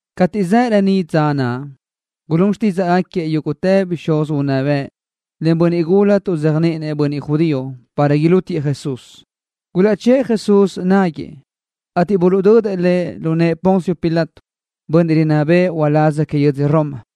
Cateʼ zaʼ reníʼ dza naʼ, gulún xtídzaʼgaquiëʼ yúguʼtë bixúz unná bëʼ len bönniʼ gula tuʼzéajniʼinëʼ bönniʼ judío para ilútiëʼ Jesús. Gulaʼchë́ʼë Jesús náguëʼë, ateʼ buluʼdödëʼ Lëʼ lu nëʼë Poncio Pilato, bönniʼ rinná bëʼë uláz que yödzö Roma.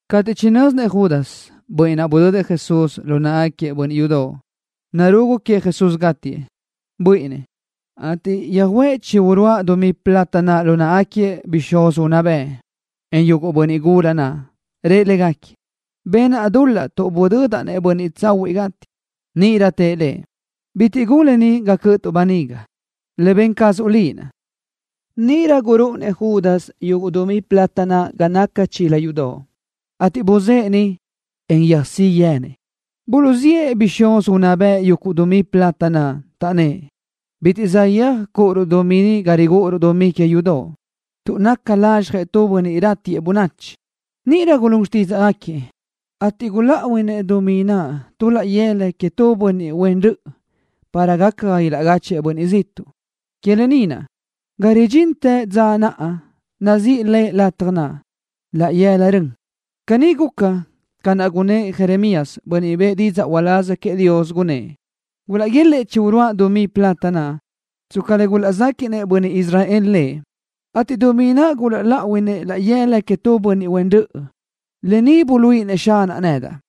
Cateʼ chinö́zinëʼ Judas, bönniʼ naʼ budödëʼ Jesús lu náʼagaquiëʼ bönniʼ yudoʼ, narugu queëʼ Jesús gátiëʼ, buíʼinnëʼ, ateʼ yöjuʼë chi uruáʼ dumí plata naʼ lu náʼagaquiëʼ bixúz unná bëʼ, en yuguʼ bönniʼ gula naʼ. Rëʼ légaquiëʼ: —Benaʼ dul-laʼ tuʼ budödaʼ-nëʼ bönniʼ tsahuiʼ gátiëʼ. Níʼirö tëʼ lëʼ: —Bitiʼ gun lë ni ga cö́ʼötuʼ böniga. Le ben cazuʼ liʼ naʼ. Níʼirö gurúʼunëʼ Judas yuguʼ dumí plata naʼ ga naca chila yudoʼ, ateʼ buzë́ʼë niʼ, en yöjsí yenëʼ. Buluʼziʼë bixúz unná bëʼ yuguʼ dumí plata naʼ, taʼnnë́ʼ: —Bitiʼ saʼyéaj cúʼuruʼ dumí ni ga rigúʼuruʼ dumí que yudoʼ, tuʼ naca lazxjëʼ tu bönniʼ ratiëʼ bönachi. Níʼirö gulún xtídzaʼgaquiëʼ, ateʼ guláʼuinëʼ dumí naʼ tu laʼ yëla queëʼ tu bönniʼ huen röʼö para gaca ga ilaʼgáchëʼë bönniʼ ziʼtuʼ. Que lë ni naʼ, ga ridxintë naʼa dza nazíʼi le lataj naʼ, Laʼ Yëla Rön. Caní guca ca naʼ gunnë́ʼ Jeremías, bönniʼ bëʼë didzaʼ uláz queëʼ Dios, gunnë́ʼ: “Gulaʼguélëʼë chi uruáʼ dumí plata naʼ, tsca le gulaʼzéquiʼnëʼ bönniʼ Israel Lëʼ, ateʼ dumí naʼ guláʼuinëʼ laʼ yëla queëʼ tu bönniʼ huen röʼö. Lë ni buluíʼinëʼ Xanaʼ nedaʼ.”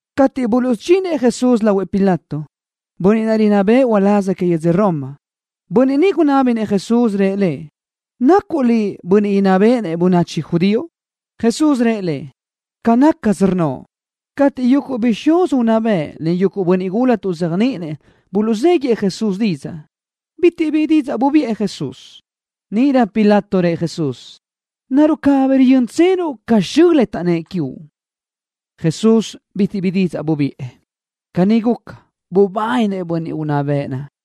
Cateʼ buluʼsudxinëʼ Jesús lahuëʼ Pilato, bönniʼ naʼ rinná bëʼë uláz que yödz Roma, bönniʼ ni gunábinëʼ Jesús, rëʼ Lëʼ: —¿Nacuʼ Liʼ Bönniʼ inná béʼenëʼ bönachi judío? Jesús rëʼ lëʼ: —Ca nácasö rnnoʼ. Cateʼ yuguʼ bixúz unná bëʼ len bönniʼ gula tuʼzéajniʼinëʼ buluʼzéguiʼë Jesús didzaʼ, bitiʼ bi didzaʼ bubiʼë Jesús. Níʼirö Pilato rëʼ Jesús: —¿Naruʼ cabí riyö́ntsenuʼ cateʼ xö le taʼnnë́ʼ quiuʼ? Jesús bitiʼ bi didzaʼ bubiʼë. Caní guca, bubáninëʼ bönniʼ unná bëʼ naʼ.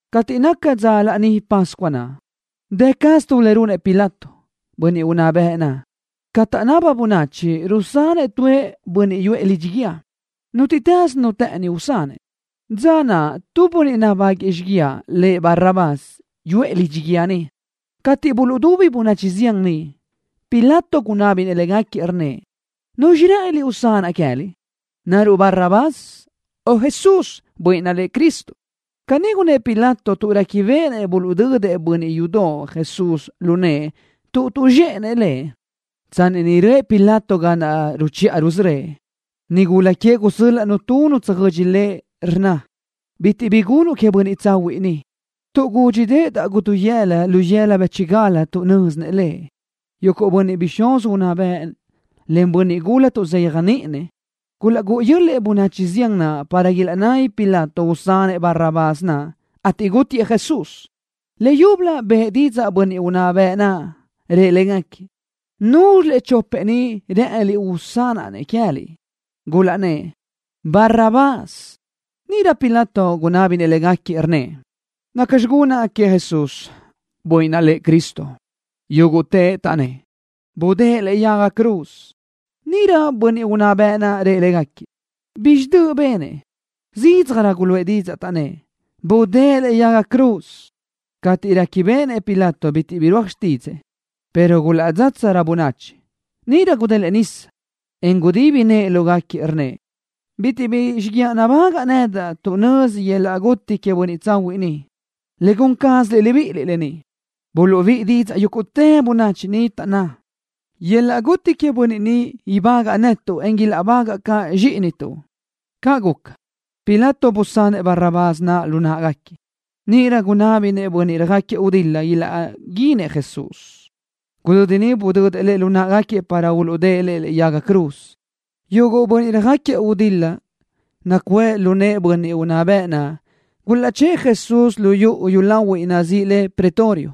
Cateʼ naca dza Laní Pascua naʼ, dë caz tu le runëʼ Pilato, bönniʼ unná bëʼ naʼ, ca taʼnaba bönachi rusanëʼ tuëʼ bönniʼ yuʼë lidxi guíë, nútiʼtës nu të́ʼëni usanëʼ. Dza naʼ tu bönniʼ nabáguëʼë xíguiaʼ, lëʼ Barrabás, yuʼë lidxi guíë niʼ. Cateʼ buluʼdubi bönachi zián niʼ, Pilato gunábinëʼ légaquiëʼ, rnnëʼ: —¿Nuzxi rë́ʼëniliʼ usanaʼ queë́liʼ? ¿Naruʼ Barrabás o Jesús, Bönniʼ naʼ lëʼ Cristo? Caní gunnë́ʼ Pilato tuʼ réquibeʼenëʼ buluʼdödëʼ bönniʼ yudoʼ Jesús lu nëʼë tuʼ tuʼzxéʼenëʼ Lëʼ. Tsanni niʼ röʼë Pilato ga naʼ ruchiʼa rusörö́ëʼ, nigula queëʼ gusö́l-laʼnu nu tsöjödxi lëʼ, rnna: —Bitiʼ bi gunuʼ queëʼ bönniʼ tsahuiʼ ni, tuʼ gúdxideʼedaʼ guduyëla lu yëla bë́chigal tuʼ nö́zinëʼ Lëʼ. Yuguʼ bixúz unná bëʼ len bönniʼ gula tuʼzéajniʼinëʼ gulaʼgúʼu yö́l-lëʼë bönachi zián naʼ para ilaʼnabi Pilato usanëʼ Barrabás naʼ, ateʼ gútiëʼ Jesús. Leyúbölö bëʼë didzaʼ bönniʼ unná bëʼ naʼ, rëʼ légaquiëʼ: —¿Núzxilëʼ chopëʼ ni rë́ʼëniliʼ usanaʼ-nëʼ queë́liʼ? Gulaʼnnë́ʼ: —Barrabás. Níʼirö Pilato gunábinëʼ légaquiëʼ, rnnëʼ: —¿Nacxi gunaʼ queëʼ Jesús, bönniʼ naʼ lëʼ Cristo? Yúguʼtëʼ taʼnnë́ʼ: —¡Budë́ʼë lëʼe yaga cruz! Níʼirö bönniʼ unná bëʼ naʼ rëʼ légaquiëʼ: —¿Bizxi döʼ benëʼ? Zídzajrö guluʼë didzaʼ, taʼnnë́ʼ: —¡Budë́ʼë lëʼe yaga cruz! Cateʼ réquibeʼenëʼ Pilato bitiʼ birúaj xtídzëʼë, pero gulaʼdzátsarö bönachi, níʼirö gudélëʼë nisa, en gudibi nëʼë lógaquiëʼ, rnnëʼ: —Bitiʼ bi xíguiaʼ nabágaʼa nedaʼ tuʼ nözi yöl-laʼ guti queëʼ bönniʼ tsahuiʼ ni. Le gun cázaliʼ libíʼiliʼ lë ni. Buluʼbíʼi didzaʼ yúguʼtë bönachi niʼ, taʼnná: —¡Yöl-laʼ guti queëʼ bönniʼ ni ibágaʼtuʼ netuʼ, en ilaʼbagaʼ caʼ zxíʼinituʼ! Caʼ guca, Pilato busanëʼ Barrabás naʼ lu náʼagaquiëʼ. Níʼirö gunná béʼenëʼ bönniʼ röjáquiëʼ gudil-la ilaʼguínëʼ Jesús, ateʼ gudödi niʼ budödëʼ Lëʼ lu náʼagaquiëʼ para uluʼdë́ʼë Lëʼ lëʼe yaga cruz. Yuguʼ bönniʼ röjáquiëʼ gudil-la nacuʼë lu nëʼë bönniʼ unná bëʼ naʼ gulaʼchë́ʼë Jesús lu yuʼu yúlahuiʼ nazíʼi le pretorio,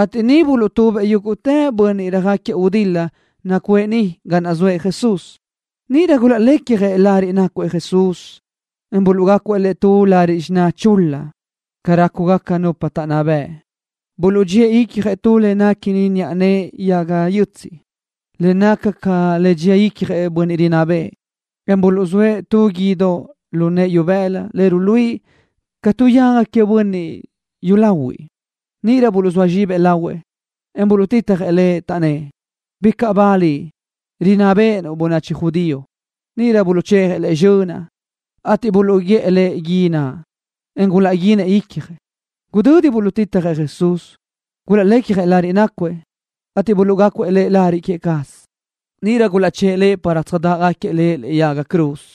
ateʼ niʼ buluʼtubëʼ yúguʼtë bönniʼ röjáquiëʼ gudil-la nacuʼë niʼ ga naʼ zoëʼ Jesús. Níʼirö gulaʼlecjëʼ lariʼ nácuëʼ Jesús, en buluʼgácuëʼ Lëʼ tu lariʼ xiná chul-la, ca rácugaca nupa taʼnná bëʼ. Buluʼdxíëʼ icjëʼ tu le néquini niʼa nëʼe yaga yötsiʼ le naca ca le dxia icjëʼ bönniʼ rinná bëʼë, en buluʼzóëʼ tu guídoʼ lu nëʼë ibëla le ruluíʼi ca tu yaga que bönniʼ yúlahuiʼ. Níʼirö buluʼzóa zxibëʼ lahuëʼ, en buluʼtitjëʼ Lëʼ, taʼnnë́ʼ: —¡Bicaʼ ba Liʼ, rinná béʼenuʼ bönachi judío! Níʼirö buluʼchejëʼ Lëʼ zxönaʼ, ateʼ buluʼguélëʼë gui naʼ, en gulaʼguínëʼ icjëʼ. Gudödi buluʼtitjëʼ Jesús, gulaʼlecjëʼ lariʼ naʼ nácuëʼ, ateʼ buluʼgácuëʼ Lëʼ lariʼ que cazëʼ. Níʼirö gulaʼchë́ʼë Lëʼ para tsöjdáʼagaquiëʼ Lëʼ lëʼe yaga cruz.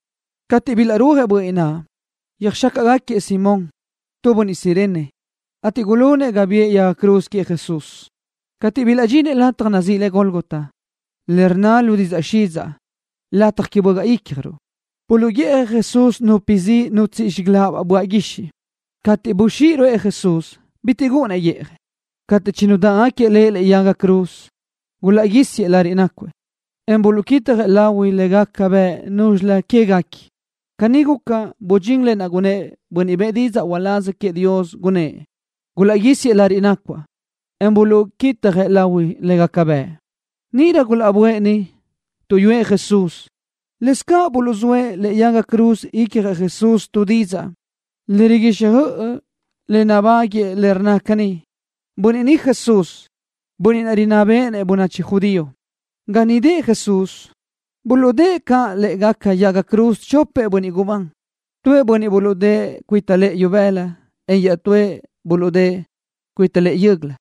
Cateʼ niʼ bilaʼrúajëʼ bönniʼ naʼ, yöjxácaʼgaquiëʼ Simón, tu bönniʼ Cirene, ateʼ gulunëʼ ga biʼë yaga cruz queëʼ Jesús. Cateʼ bilaʼdxinëʼ lataj nazíʼi le Gólgota, le rnna lu didzaʼ xidzaʼ, Lataj Que Bögaʼ Ícjaruʼ, buluʼguiʼjëʼ Jesús nupi zi nutsíʼi zxígalaʼabaʼ böaʼ guixiʼ. Cateʼ buxíʼi ruʼë Jesús, bitiʼ gúʼunnëʼ guíʼjëʼ. Cateʼ chinudáʼagaquiëʼ Lëʼ lëʼe yaga cruz, gulaʼguísiëʼ lariʼ nácuëʼ, en buluʼquitjëʼ lahui le gaca bëʼ núzxilëʼ guequi queëʼ. Caní guca, budxín lë naʼ gunnë́ʼ bönniʼ bëʼë didzaʼ uláz queëʼ Dios, gunnë́ʼ: “Gulaʼguísiëʼ lariʼ nácuaʼ, en buluʼquitjëʼ lahui le gaca bëʼ.” Níʼirö gulaʼböʼë niʼ, tuʼyúëʼ Jesús. Lëscaʼ buluʼzóëʼ lëʼe yaga cruz ícjalëʼ Jesús tu didzaʼ le riguixjöʼ le nabáguëʼë le rnna caní: “Bönniʼ ni Jesús, Bönniʼ rinná béʼenëʼ bönachi judío.” Ga niʼ dëʼë Jesús, buluʼdë́ʼë caʼ lë́ʼegaca yaga cruz chopëʼ bönniʼ gubán. Tuëʼ buluʼdë́ʼë cuita lëʼë ibëla, en iaʼtúëʼ naʼ cuita lëʼë yö́göla.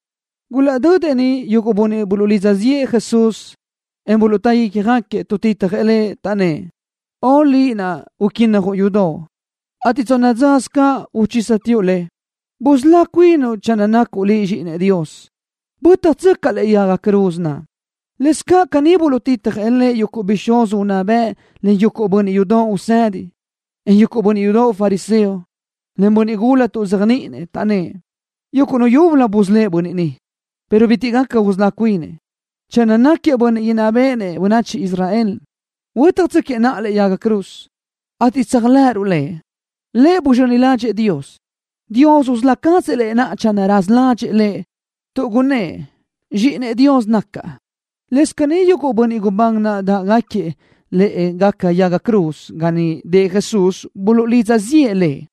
Gulaʼdödëʼ niʼ yuguʼ bönniʼ buluʼlidza ziʼë Jesús, en buluʼtá ícjagaquiëʼ, tuʼtitjëʼ Lëʼ, taʼnnë́ʼ: —¡Ön, Liʼ naʼ uquínnajuʼ yudoʼ, ateʼ tsonna dzasö caʼ uchísatsoʼ le! ¡Busölá cuinuʼ naʼa channö nacuʼ Liʼ Zxíʼinëʼ Dios! ¡Bö́tjatsöcaʼ lëʼe yaga cruz naʼ! Lëscaʼ caní buluʼtitjëʼ Lëʼ yuguʼ bixúz unná bëʼ len yuguʼ bönniʼ yudoʼ usedi, en yuguʼ bönniʼ yudoʼ fariseo, len bönniʼ gula tuʼzéajniʼinëʼ, taʼnnë́ʼ: —Yuguʼ nu yúbölö busölë́ʼ bönniʼ ni, pero bitiʼ gaca usölá cuinëʼ. Channö náquiëʼ Bönniʼ inná béʼenëʼ bönachi Israel, huö́tjatsöquiëʼ naʼa lëʼe yaga cruz, ateʼ tséajlëʼëruʼ Lëʼ. Lëʼ buzxöni ládxëʼë Dios. Dios usölá cazëʼ Lëʼ naʼa channö raza ládxëʼë Lëʼ, tuʼ gunnë́ʼ: “Zxíʼinëʼ Dios nacaʼ.” Lëscaʼ caní yuguʼ bönniʼ gubán naʼ dáʼgaquiëʼ lë́ʼegaca yaga cruz ga niʼ dëʼë Jesús buluʼlidza ziʼë Lëʼ.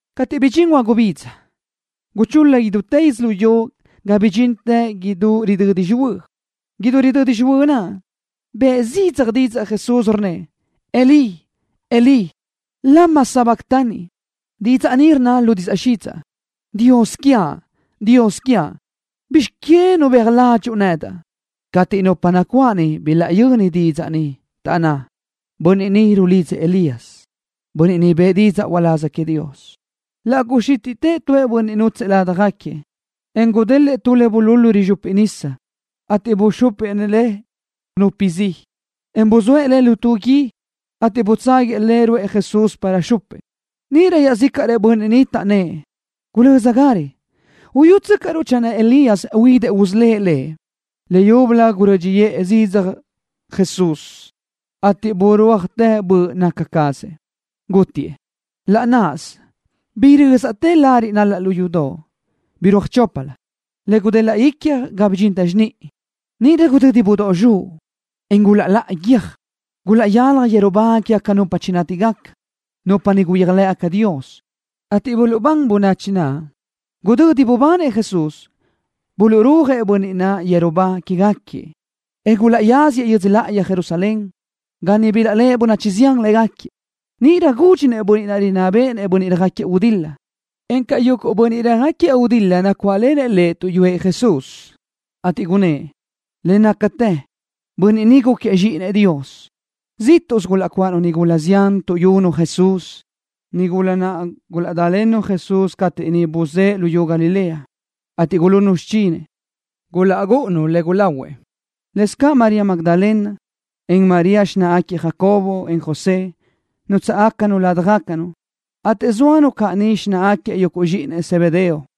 Cateʼ bidxín huagubidza, guchul-la idútë yödzölió ga bidxintë idú ridödi xihuö́. Idú ridödi xihuö́ naʼ, bëʼë zidzaj didzaʼ Jesús, rnnëʼ: —Elí, Elí, ¿lama sabactani? Didzaʼ ni rnna lu didzaʼ xidzaʼ: “Dios quiaʼ, Dios quiaʼ, ¿bizx que nubéaj ládxuʼu nedaʼ?” Cateʼ nupa nacuáʼ niʼ bilaʼyöni didzaʼ ni, taʼnná: —Bönniʼ ni rulidzëʼ Elías, bönniʼ niʼ bëʼë didzaʼ uláz queëʼ Dios. Laʼ guxítiʼtëʼ tuëʼ bönniʼ nútsëʼë ládjagaquiëʼ, en gudélëʼë tu le bululu rizxupi nisa, ateʼ buxúpinëʼ le nupi zi, en buzóëʼ le tu lu gui, ateʼ butságuiëʼ le ruʼë Jesús para xupëʼ. Níʼirö iaʼzícaʼrëʼ bönniʼ niʼ taʼnnë́ʼ: —¡Gulö́zagarö! ¡Uyútsöcaʼruʼ channö huidëʼ Elías usölë́ʼ Lëʼ! Leyúbölö gurö́dxiʼë zidzaj Jesús, ateʼ burúajtë böʼ naca cazëʼ, gútitëʼ. Laʼ náʼasö birö́zaʼtë lariʼ nal-laʼ lu yudoʼ, birúaj choplö, le gudelaʼ icjlö ga bidxintë xiníʼi. Níʼirö gudödi budóʼ zxuʼ, en gulaʼláʼa guiö́j. Gulaʼyalaj yeru ba quégaca nupa chinátigaca, nupa niʼ gulaʼyéajlëʼ Dios, ateʼ buluʼbán bönachi naʼ. Gudödi bubanëʼ Jesús, buluʼrúajëʼ bönniʼ naʼ yeru ba quégaquiëʼ, en gulaʼyáziëʼ yödzö láʼayi Jerusalén, ga niʼ bilaʼléʼe bönachi zián légaquiëʼ. Níʼirö gúdxinëʼ bönniʼ naʼ rinná béʼenëʼ bönniʼ röjáquiëʼ gudil-la, encaʼ yuguʼ bönniʼ röjáquiëʼ gudil-la nacuáʼlenëʼ lëʼ tuʼyúëʼ Jesús, ateʼ gunnë́ʼ: —Le nácatë bönniʼ ni gúquiëʼ Zxíʼinëʼ Dios. Zíʼtuʼsö gulaʼcuáʼanu nigula zián tuʼyunu Jesús, nigula naʼ gulaʼdálennu Jesús cateʼ niʼ buzë́ʼë luyú Galilea, ateʼ gulunnu xichinëʼ, gulaʼgúʼunu le gulahuëʼ. Lëscaʼ María Magdalena, en María, xináʼagaquiëʼ Jacobo, en José, nútsaʼgacanu ládjagacanu, ateʼ zóanu caʼ niʼ xináʼagaquiëʼ yuguʼ zxíʼinëʼ Zebedeo.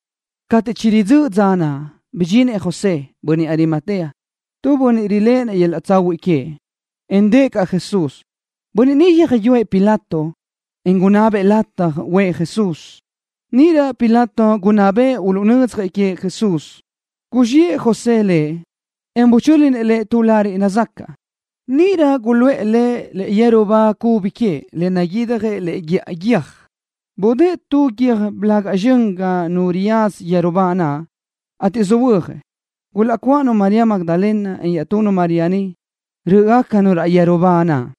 Cateʼ chiridzö́ʼ dza naʼ, bidxinëʼ José, bönniʼ Arimatea, tu bönniʼ riléʼenëʼ yöl-laʼ tsahuiʼ queëʼ, en dëʼë caʼ Jesús. Bönniʼ ni yöjyúëʼ Pilato, en gunabëʼ lataj uʼë Jesús. Níʼirö Pilato gunná bëʼë uluʼnödzjëʼ queëʼ Jesús. Guzxiʼë José Lëʼ, en buchö́linëʼ Lëʼ tu lariʼ nazacaʼ. Níʼirö guluʼë Lëʼ lu yeru ba cubi queëʼ le naguidjëʼ lëʼe guíʼa guiö́j. Budë́ʼë tu guiö́j blaga zxön ga nu riyaza yeru ba naʼ, ateʼ söhuö́jëʼ. Gulaʼcuáʼanu María Magdalena, en iaʼtunu María niʼ, rö́ʼgacanu raʼ yeru ba naʼ.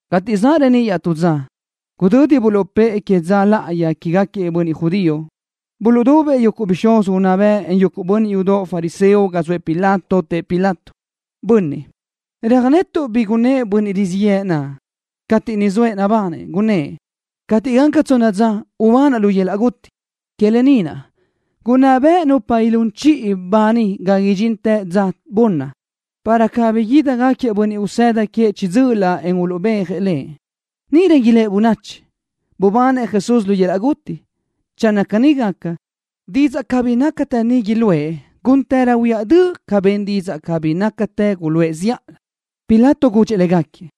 Cateʼ zaʼ reníʼ iaʼtú dza, gudödi buluʼpë́ʼë que dza láʼayi quégaquiëʼ bönniʼ judío, buluʼdubëʼ yuguʼ bixúz unná bëʼ, en yuguʼ bönniʼ yudoʼ fariseo ga zoëʼ Pilato. Tëʼ Pilato: —Bönniʼ, röjnetuʼ bi gunnë́ʼ bönniʼ rizíʼ yëʼë naʼ, cateʼ niʼ zoëʼ nabanëʼ, gunnë́ʼ: “Cateʼ gaca tsonna dza ubanaʼ lu yöl-laʼ guti.” Que lë ni naʼ gunná beʼe nupa ilún chiʼi ba niʼ ga idxintë dza bunni, para cabí ídigaquiëʼ bönniʼ usëda queëʼ chiʼi dzö́ʼölö, en uluʼbéajëʼ Lëʼ. Níʼirö ilë́ʼ bönachi: “Bubanëʼ Jesús lu yöl-laʼ guti.” Channö caní gaca, didzaʼ cabí nácatë ni iluʼë gúntërö huiáʼ döʼ ca ben didzaʼ cabí nácatë naʼ guluʼë zíʼalö. Pilato gudxëʼ légaquiëʼ: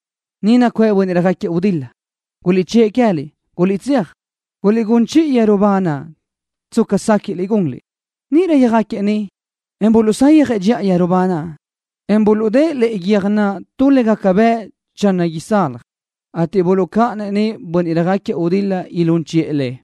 —Ni nacuʼë bönniʼ röjáquiëʼ gudil-la. Guliʼchë́ʼë queë́liʼ. Guliʼtséaj, guliʼgún chiʼi yeru ba naʼ tsca séquiʼliʼ gunliʼ. Níʼirö yöjáquiëʼ niʼ, en buluʼsayjëʼ dxiʼa yeru ba naʼ, en buluʼdë́ʼë lëʼe guiö́j naʼ tu le gaca bëʼ channö isalaj, ateʼ buluʼcáʼanëʼ niʼ bönniʼ röjáquiëʼ gudil-la ilún chiʼë le.